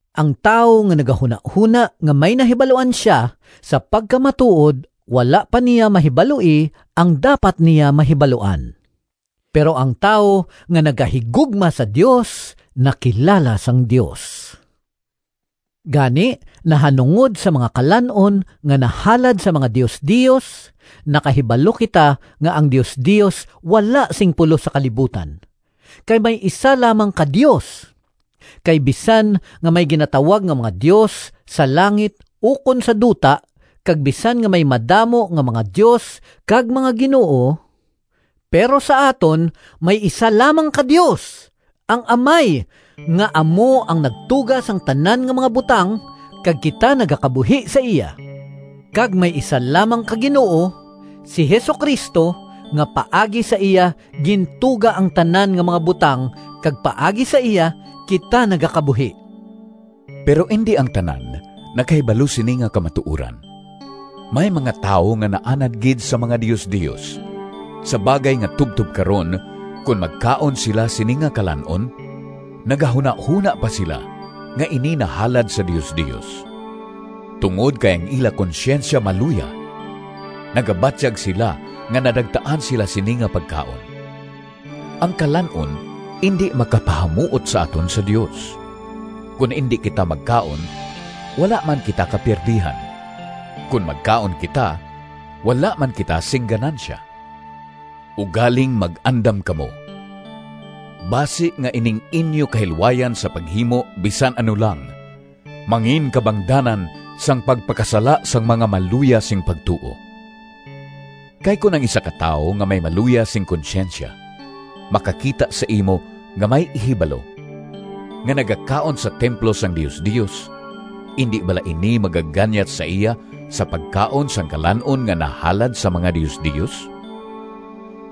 Ang tawo nga nagahunahona nga may nahibaluan sia, sa pagkamatuod wala pa niya mahibaloi ang dapat niya mahibaluan. Pero ang tawo nga nagahigugma sa Dios nakilala sang Dios. Gani, nahanungod sa mga kalan-on nga nahalad sa mga diosdios, nakahibalo kita nga ang diosdios wala sing pulos sa kalibutan. Kay may isa lamang ka Dios. Kay bisan nga may ginatawag nga mga “dios” sa langit ukon sa duta, kag bisan nga may madamo nga mga “dios” kag mga “ginoo,” pero sa aton may isa lamang ka Dios, ang Amay, nga amo ang nagtuga sang tanan nga mga butang, kag kita nagakabuhi sa iya. Kag may isa lamang ka Ginoo, si Jesu-Cristo, nga paagi sa iya gintuga ang tanan nga mga butang kag paagi sa iya kita nagakabuhi. Pero indi ang tanan nakahibalo sini nga kamatuoran. May mga tawo nga naanad gid sa mga diosdios, sa bagay nga tubtob karon kon magkaon sila sini nga kalan-on nagahunahona pa sila nga ini nahalad sa diosdios. Tungod kay ang ila konsyensya maluya, nagabatyag sila nga nadagtaan sila sini nga pagkaon. Ang kalan-on indi makapahamuot sa aton sa Dios. Kon indi kita magkaon wala man kita kapiyerdihan, kon magkaon kita wala man kita sing ganansya. Ugaling mag-andam kamo, basi nga ining inyo kahilwayan sa paghimo bisan ano lang manginkabangdanan sang pagpakasala sang mga maluya sing pagtuo. Kay kon ang isa ka tawo nga may maluya sing konsyensya makakita sa imo nga may “ihibalo” nga nagakaon sa templo sang diosdios, indi bala ini magaganyat sa iya sa pagkaon sang kalan-on nga nahalad sa mga diosdios?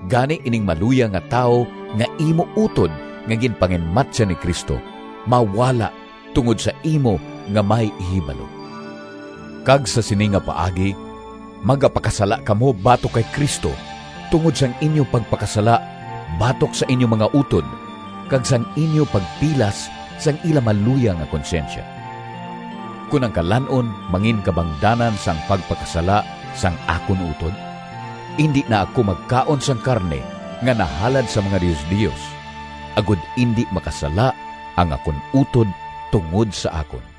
Gani ining maluya nga tawo nga imo utod nga ginpanginmatyan ni Cristo, mawala tungod sa imo nga may “ihibalo”! Kag sa sini nga paagi magapakasala kamo batok kay Cristo tungod sang inyo pagpakasala batok sa inyo mga utod kag sang inyo pagpilas sang ila maluya nga konsyensya. Kon ang kalan-on manginkabangdanan sang pagpakasala sang akon utod, indi na ako magkaon sang karne nga nahalad sa mga diosdios agod indi makasala ang akon utod tungod sa akon.